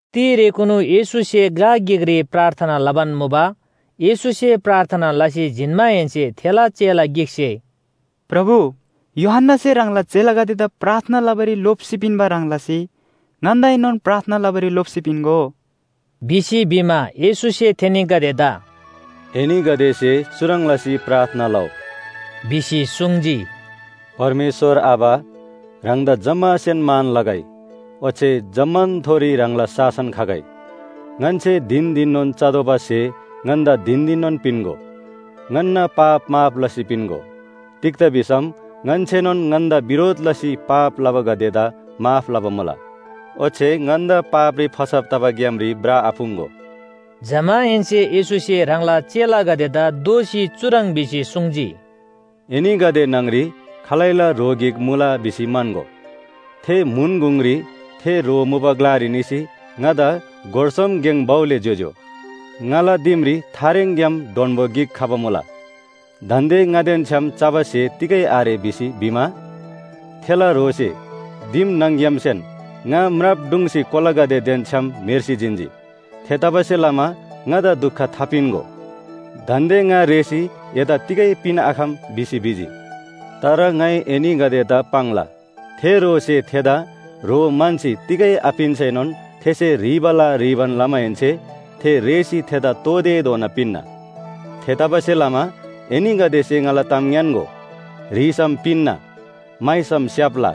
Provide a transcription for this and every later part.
तिरेकुनु येशूसे ग्‍ला गिकरी प्रार्थना लबान मुबा। येशूसे प्रार्थना लसी जिन्‍माहेन्‍से थेला चेला गिकसे “प्रभु, यूहन्‍नासे ह्राङला चेलागदेदा प्रार्थना लबारी लोप्‍सी पिन्‍बा ह्रङ् लसी ङन्‍दाएनोन प्रार्थना लबारी लोप्‍सी पिन्‍गो” भिसी भिमा, येशूसे थेनीगदेदा “एनीगदेसे चुह्रङ् लसी प्रार्थना लउ” भिसी सुङ्जी, “परमेश्‍वर आबा, ह्राङदा जम्‍मासेन मान लगै, ओच्‍छे जम्‍मानथोरी ह्राङला शासन खगै। ङन्‍से धिन धिननोन चतोःबा स्‍हे ङन्‍दा धिन धिननोन पिन्‍गो। ङन्‍ना पाप माफ लसी पिन्‍गो। तिग्‍दा भिसम ङन्‍सेनोन ङन्‍दा बिरोध लसी पाप लबागदेदा माफ लबा मुला। ओच्‍छे ङन्‍दा पापरी फसब तबा ग्‍यामरी भ्रआपुङ्‍गो।” जमाहेन्‍से येशूसे ह्राङला चेलागदेदा दोःसी चुह्रङ् भिसी सुङ्जी, “एनीगदे न्‍हङरी खालैला ह्रो गिक मुला भिसी म्‍हन्‍गो। थे म्‍हुन गुङरी थे ह्रो मुबा ग्‍लारी निसी ‘ङादा गोर सोम गेङ भउले ज्‍योज्‍यो, ङाला दिमरी थारेङग्‍याम डोन्‍बो गिक खबा मुला। दान्‍दे ङादेन छ्‌याम चबा स्‍हे तिगै आरे’ भिसी भिमा, थेला ह्रोसे दिम न्‍हङ‌ग्‍यामसेन ‘ङा म्राप ढुङ्सी कोलागदेदेन छ्‌याम म्‍हेर्सी जिन्‍जी। थेतबासेलमा ङादा दुख थापिन्‍गो। दान्‍दे ङा रेःसी एदा तिगै पिन्‍आखम’ भिसी भिजी। तर ङाइ एनीगदेदा पाङ्ला, थे ह्रोसे थेदा ह्रो म्‍हन्‍सी तिगै आपिन्‍सैनोन थेसे ह्रीबाला ह्रीबान लमाहेन्‍से थे रेःसी थेदा तोःतेधोना पिन्‍ना। “थेतबासेलमा एनीगदेसे ङाला ताम ङ्‌यान्‍गो, ह्रीसम पिन्‍ना, म्‍हाइसम स्‍याप्‍ला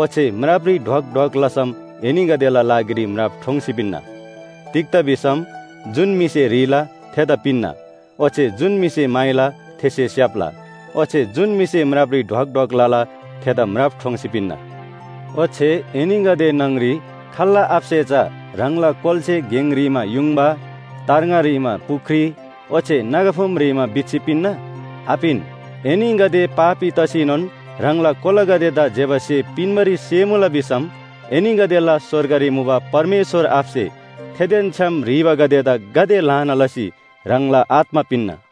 ओच्‍छे म्रापरी ढ्वक ढ्वक लसम एनीगदेला लागिरी म्राप ठोङ्सी पिन्‍ना। तिग्‍दा भिसम जुन म्‍हिसे ह्रीला थेदा पिन्‍ना, ओच्‍छे जुन म्‍हिसे म्‍हाइला थेसे स्‍याप्‍ला ओच्‍छे जुन म्‍हिसे म्रापरी ढ्वाक ढ्वाक लला थेदा म्राप ठोङ्सी पिन्‍ना। “ओच्‍छे एनीगदे न्‍हङरी खाल्‍ला आबासे चा ह्राङला कोलासे गेङ ह्रीमा युङबा, तार्ङा ह्रीमा पुख्री, ओच्‍छे नागाफुम ह्रीमा बिच्‍छी पिन्‍ना? आपिन। एनीगदे पापी तसीनोन ह्राङला कोलागदेदा ज्‍यबा स्‍हे पिन्‍बारी सेमुला भिसम एनीगदेला स्‍वर्गरी मुबा परमेश्‍वर आबासे थेदेन छ्‌याम ह्रीबागदेदा गाते ल्‍हाना लसी ह्राङला आत्‍मा पिन्‍ना।”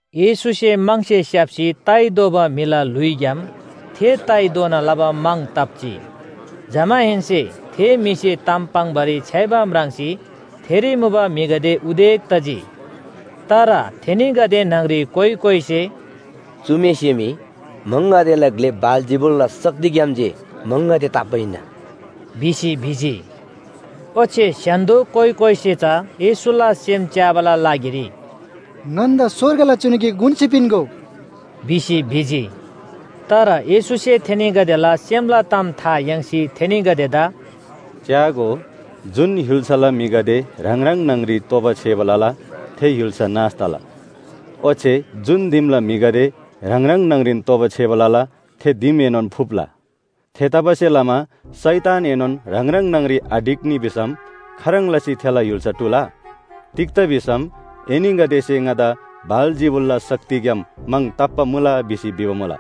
येशूसे म्‍हङसे स्‍याप्‍सी ताइ दोबा म्‍हिला ल्‍हुइग्‍याम थे ताइ दोना लबा म्‍हङ ताप्‍जी। जमाहेन्‍से थे म्‍हिसे ताम पाङ्‌बारी छ्‌याइबा म्राङ्सी थेरी मुबा म्‍हिगदे उदेक तजी। तर थेनीगदे न्‍हङरी कोइ कोइसे “चु म्‍हिसे मी म्‍हङगदेला ग्‍ले बालजिबुलला शक्तिग्‍याम जे म्‍हङगदे ताप्‍बा हिन्‍ना” भिसी भिजी। ओच्‍छे स्‍य्‍हान्‍दो कोइ कोइसे चा येशूला सेम च्‍याबाला लागिरी “ङन्‍दा स्‍वर्गला चिनु गिक उन्‍सी पिन्‍गो” भिसी भिजी। तर येशूसे थेनीगदेला सेमला ताम था याङ्सी थेनीगदेदा “च्‍यागो, जुन य्‍हुल्‍साला म्‍हिगदे ह्राङ ह्राङ न्‍हङरी तोबा छेबा लला, थे य्‍हुल्‍सा नाश तला, ओच्‍छे जुन दिमला म्‍हिगदे ह्राङ ह्राङ न्‍हङरीन तोबा छेबा लला, थे दिमएनोन फुप्‍ला।” थेतबासेलमा शैतानएनोन ह्राङ ह्राङ न्‍हङरी आढिक्‍नी भिसम खाह्रङ् लसी थेला य्‍हुल्‍सा टुला? तिग्‍दा भिसम एनीगदेसे ङादा बालजिबुलला शक्तिग्‍याम म्‍हङ ताप्‍बा मुला भिसी भिबा मुला।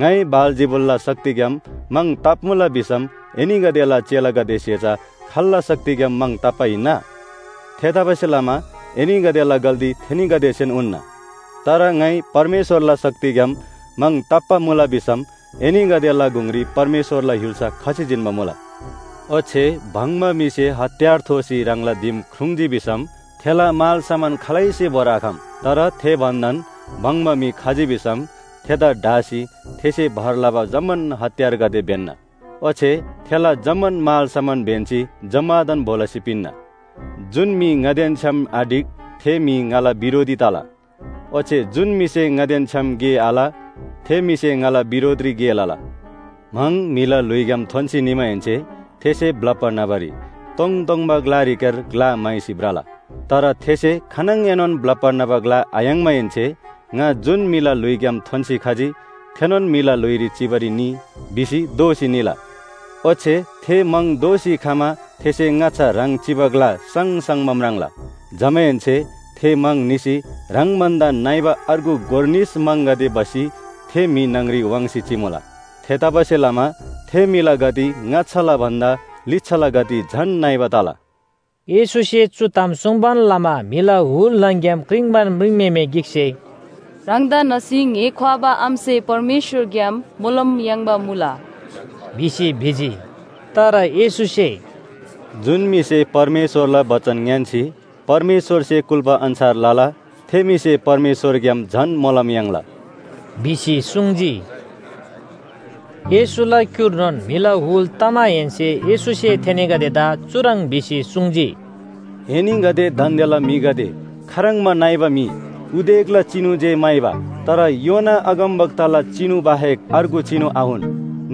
ङाइ बालजिबुलला शक्तिग्‍याम म्‍हङ ताप्‍मुला भिसम एनीगदेला चेलागदेसे चा खाल्‍ला शक्तिग्‍याम म्‍हङ ताप्‍बा हिन्‍ना? थेतबासेलमा एनीगदेला गल्‍ती थेनीगदेसेन उन्‍ना। तर ङाइ परमेश्‍वरला शक्तिग्‍याम म्‍हङ ताप्‍बा मुला भिसम एनीगदेला गुङरी परमेश्‍वरला य्‍हुल्‍सा खसी जिन्‍बा मुला। ओच्‍छे भङ्‍बा म्‍हिसे हतियार थोसी ह्राङला दिम ख्रुङ्जी भिसम थेला मालसामान खालैसे भोरआखम। तर थे भन्‍दान भङ्‍बा म्‍हि खजी भिसम थेदा ढासी थेसे भर लबा जम्‍मान हतियारगदे ब्‍यन्‍ना, ओच्‍छे थेला जम्‍मान मालसामान ब्‍यन्‍सी जम्‍मादान भो लसी पिन्‍ना। जुन म्‍हि ङादेन छ्‌याम आढिक, थे म्‍हि ङाला बिरोधी तला। ओच्‍छे जुन म्‍हिसे ङादेन छ्‌याम गे आल थे म्‍हिसे ङाला बिरोधरी गे लला। “म्‍हङ म्‍हिला ल्‍हुइग्‍याम थोन्‍सी निमाहेन्‍से थेसे ब्‍लप्‍बा न्‍हबारी तोङतोङबा ग्‍लारीक्‍यार ग्‍ला म्‍हाइसी भ्रला, तर थेसे खानङएनोन ब्‍लप्‍बा न्‍हबा ग्‍ला आयाङ्माहेन्‍से ‘ङा जुन म्‍हिला ल्‍हुइग्‍याम थोन्‍सी खजी थेनोन म्‍हिला ल्‍हुइरी चिबारी निइ’ भिसी दोःसी निला। ओच्‍छे थे म्‍हङ दोःसी खमा थेसे ङाच्‍छा ह्राङ चिबा ग्‍ला साङसाङबा म्राङ्ला। जमाहेन्‍से थे म्‍हङ निसी ह्राङ भन्‍दा नइबा अर्गु गोर निस म्‍हङगदे भसी थे म्‍हि न्‍हङरी वाङ्सी चिमुला। थेतबासेलमा थे म्‍हिला गति ङाच्‍छाला भन्‍दा लिच्‍छाला गति झन नइबा तला।” येशूसे चु ताम सुङ्बान लमा म्‍हिला हुल न्‍हङ‍ग्‍याम क्रिङ्बान म्रिङम्‍हेमे गिकसे “ह्राङदा न्‍हसी ङ्‍हे ख्‍वाबा आमासे परमेश्‍वरग्‍याम मोलम याङ्बा मुला,” भिसी भिजी। तर येशूसे “जुन म्‍हिसे परमेश्‍वरला बचन ङ्‌यान्‍सी परमेश्‍वरसे कुल्‍बा अन्‍छार लला, थे म्‍हिसे परमेश्‍वरग्‍याम झन मोलम याङ्ला,” भिसी सुङ्जी। येशूला क्‍युर्नोन म्‍हिला हुल तमाहेन्‍से येशूसे थेनीगदेदा चुह्रङ् भिसी सुङ्जी, “एनीगदे दान्‍देला म्‍हिगदे खाह्रङ्बा नइबा म्‍हि! उदेकला चिनु जे म्‍हाइबा। तर योना अगमवक्ताला चिनु बाहेक अर्गु चिनु आउन।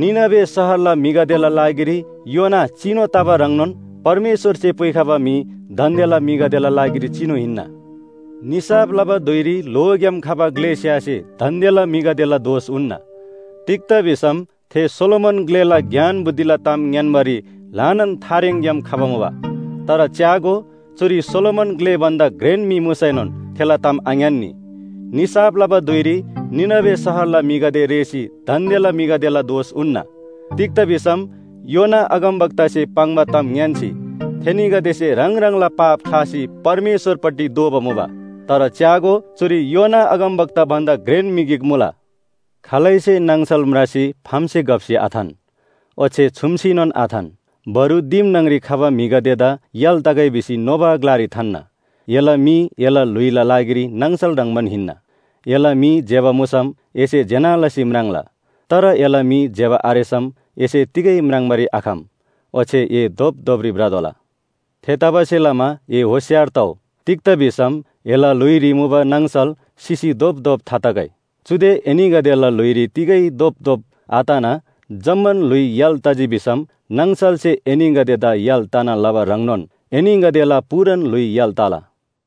निनवे शहरला म्‍हिगदेला लागिरी योना चिनु तबा ह्रङ्नोन परमेश्‍वरसे पुइखबा म्‍हि दान्‍देला म्‍हिगदेला लागिरी चिनु हिन्‍ना। निसाफ लबा धुइरी ल्‍होग्‍याम खबा ग्‍लेस्‍यासे दान्‍देला म्‍हिगदेला दोष उन्‍ना, तिग्‍दा भिसम थे सोलोमन ग्‍लेला ज्ञान बुद्धिला ताम ङ्‌यान्‍बारी ल्‍हानान थारेङग्‍याम खबा मुबा। तर च्‍यागो, चुरी सोलोमन ग्‍ले भन्‍दा घ्रेन म्‍हि मुसैनोन थेला ताम आङ्‌यान्‍नी। निसाफ लबा धुइरी निनवे शहरला म्‍हिगदे रेःसी दान्‍देला म्‍हिगदेला दोष उन्‍ना। तिग्‍दा भिसम योना अगमवक्तासे पाङ्बा ताम ङ्‌यान्‍सी थेनीगदेसे ह्राङ ह्राङला पाप ख्‍लासी परमेश्‍वरपट्टि दोःबा मुबा। तर च्‍यागो, चुरी योना अगमवक्ता भन्‍दा घ्रेन म्‍हि गिक मुला। “खालैसे नाङसल म्रासी फामसे घप्‍सी आथान, ओच्‍छे छुम्‍सीनोन आथान। बरु दिम न्‍हङरी खबा म्‍हिगदेदा य्‍हाल तगै भिसी नोबा ग्‍लारी थान्‍ना। एला मी एला ल्‍हुइला लागिरी नाङसल ह्रङ्‌बान हिन्‍ना। एला मी ज्‍यबा मुसम एसे ज्‍यना लसी म्राङ्ला। तर एला मी ज्‍यबा आरेसम एसे तिगै म्राङ्बारी आखम ओच्‍छे ए धोपधोपरी भ्रतोःला। थेतबासेलमा ए होशियार तउ, तिग्‍दा भिसम एला ल्‍हुइरी मुबा नाङसल सिसी धोपधोप थातगै। चुदे एनीगदेला ल्‍हुइरी तिगै धोपधोप आतना जम्‍मान ल्‍हुइ य्‍हाल तजी भिसम नाङसलसे एनीगदेदा य्‍हाल तना लबा ह्रङ्नोन एनीगदेला पूरान ल्‍हुइ य्‍हाल तला।”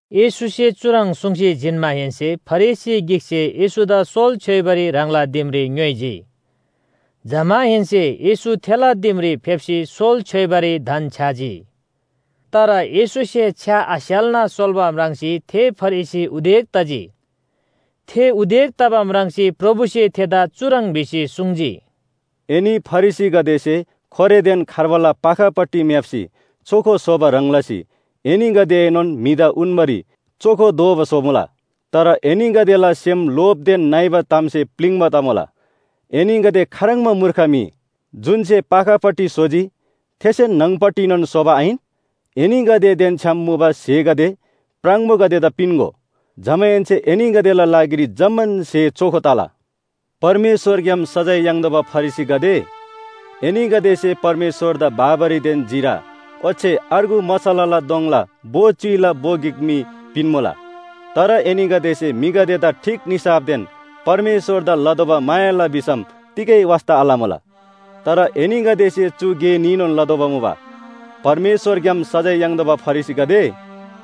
येशूसे चुह्रङ् सुङ्सी जिन्‍माहेन्‍से फरिसी गिकसे येशूदा सोल छ्‌योइबारी ह्राङला दिमरी ङ्‌योइजी। जमाहेन्‍से येशू थेला दिमरी फेप्‍सी सोल छ्‌योइबारी धन्‍छ्‌याजी। तर येशूसे छ्‌या आस्‍याल्‍ना सोल्‍बा म्राङ्सी थे फरिसी उदेक तजी। थे उदेक तबा म्राङ्सी प्रभुसे थेदा चुह्रङ् भिसी सुङ्जी, “एनी फरिसीगदेसे खोरेदेन खार्बाला पाखापट्टि म्‍याप्‍सी चोखो स्‍होबा ह्रङ् लसी एनीगदेएनोन म्‍हिदा उन्‍बारी चोखो दोबा स्‍होमुला। तर एनीगदेला सेम लोभदेन नइबा तामसे प्‍लिङ्बा तमुला। एनीगदे खाह्रङ्बा मूर्ख म्‍हि, जुन‍से पाखापट्टि स्‍होजी, थेसेन न्‍हङपट्टिनोन स्‍होबा आहिन? एनीगदेदेन छ्‌याम मुबा स्‍हेगदे प्राङबोगदेदा पिन्‍गो। जमाहेन्‍से एनीगदेला लागिरी जम्‍मान स्‍हे चोखो तला। परमेश्‍वरग्‍याम सजाय याङ्तोःबा फरिसीगदे, एनीगदेसे परमेश्‍वरदा बाबरीदेन जिरा ओच्‍छे अर्गु मसलाला दोङला भो च्‍युइला भो गिक मी पिन्‍मुला, तर एनीगदेसे म्‍हिगदेदा ठीक निसाफदेन परमेश्‍वरदा लतोःबा मायाला भिसम तिगै वास्‍ता आलमुला। तर एनीगदेसे चु गे न्‍हीनोन लतोःबा मुबा। परमेश्‍वरग्‍याम सजाय याङ्बा फरिसीगदे,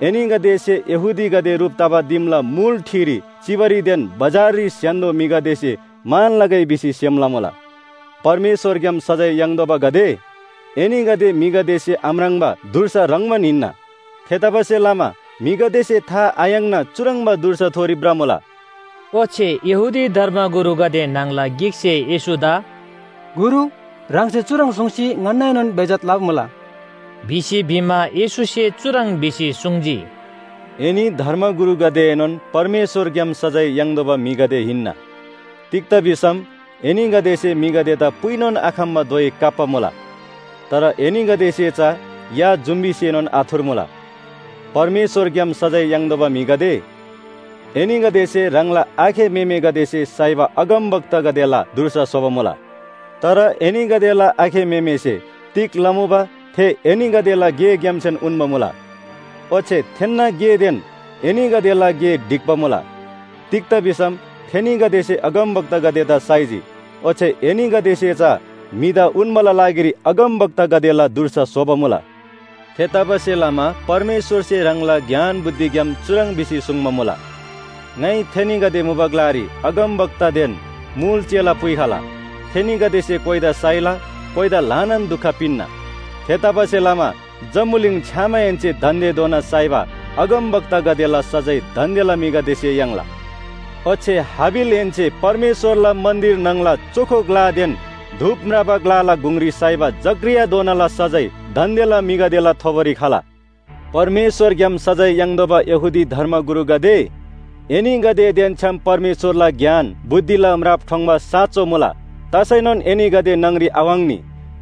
एनीगदेसे यहूदीगदे ह्रुप तबा दिमला मुल ठिरी चिबारीदेन बजाररी स्‍य्‍हान्‍दो म्‍हिगदेसे मान लगै भिसी सेम लमुला। परमेश्‍वरग्‍याम सजाय याङ्तोःबागदे, एनीगदे म्‍हिगदेसे आम्राङ्बा धुर्सा ह्रङ्‌बान हिन्‍ना। थेतबासेलमा म्‍हिगदेसे था आयाङ्ना चुह्रङ्बा धुर्साथोरी भ्रमुला।” ओच्‍छे यहूदी धर्मगुरुगदे न्‍हङला गिकसे येशूदा “गुरु ह्राङसे चुह्रङ् सुङ्सी ङन्‍नाएनोन बेइज्‍जत लबा मुला” भिसी भिमा, येशूसे चुह्रङ् भिसी सुङ्जी, “एनी धर्मगुरुगदेएनोन परमेश्‍वरग्‍याम सजाय याङ्तोःबा म्‍हिगदे हिन्‍ना। तिग्‍दा भिसम एनीगदेसे म्‍हिगदेदा पुइनोन आखम्‍बा धोइ काप्‍बा मुला। तर एनीगदेसे चा या जुम्‍बीसेनोन आथुर्मुला। “परमेश्‍वरग्‍याम सजाय याङ्तोःबा म्‍हिगदे, एनीगदेसे ह्राङला आखे म्‍हेमेगदेसे साइबा अगमवक्तागदेला धुर्सा स्‍होबा मुला। तर एनीगदेला आखे म्‍हेमेसे तिग लमुबा थे एनीगदेला गेग्‍यामसेन उन्‍बा मुला। ओच्‍छे थेन्‍ना गेदेन एनीगदेला गे ढिक्‍बा मुला। तिग्‍दा भिसम थेनीगदेसे अगमवक्तागदेदा साइजी, ओच्‍छे एनीगदेसे चा म्‍हिदा उन्‍बाला लागिरी अगमवक्तागदेला धुर्सा स्‍होबा मुला। थेतबासेलमा परमेश्‍वरसे ह्राङला ज्ञान बुद्धिग्‍याम चुह्रङ् भिसी सुङ्बा मुला, ‘ङाइ थेनीगदे मुबा ग्‍लारी अगमवक्तादेन मुल चेला पुइखला थेनीगदेसे कोइदा साइला कोइदा ल्‍हानान दुख पिन्‍ना।’ थेतबासेलमा जम्‍बुलिङ छ्‌यामाहेन्‍से दान्‍देधोना साइबा अगमवक्तागदेला सजाय दान्‍देला म्‍हिगदेसे याङ्ला। ओच्‍छे हाबिलहेन्‍से परमेश्‍वरला मन्‍दिर न्‍हङला चोखो ग्‍लादेन धूप म्राबा ग्‍लाला गुङरी साइबा जकरियाधोनाला सजाय दान्‍देला म्‍हिगदेला थोबोरी खला। “परमेश्‍वरग्‍याम सजाय याङ्तोःबा यहूदी धर्मगुरुगदे, एनीगदेदेन छ्‌याम परमेश्‍वरला ज्ञान, बुद्धिला म्राप ठोङ्‌बा साँचो मुला। तसैनोन एनीगदे न्‍हङरी आवाङ्नी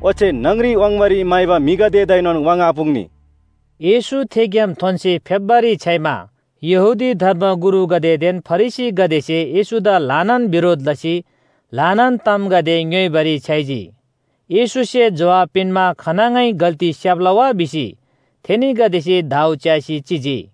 ओच्‍छे न्‍हङरी वाङ्बारी म्‍हाइबा म्‍हिगदेदाएनोन वाङ्आपुङ्नी।” येशू थेग्‍याम थोन्‍सी फेप्‍बारी छ्‌याइमा यहूदी धर्मगुरुगदेदेन फरिसीगदेसे येशूदा ल्‍हानान बिरोध लसी ल्‍हानान तामगदे ङ्‌योइबारी छ्‌याइजी। येशूसे जोहाब पिन्‍मा खानङै गल्‍ती स्‍याप्‍ला वा भिसी थेनीगदेसे दाउ च्‍यासी चिजी।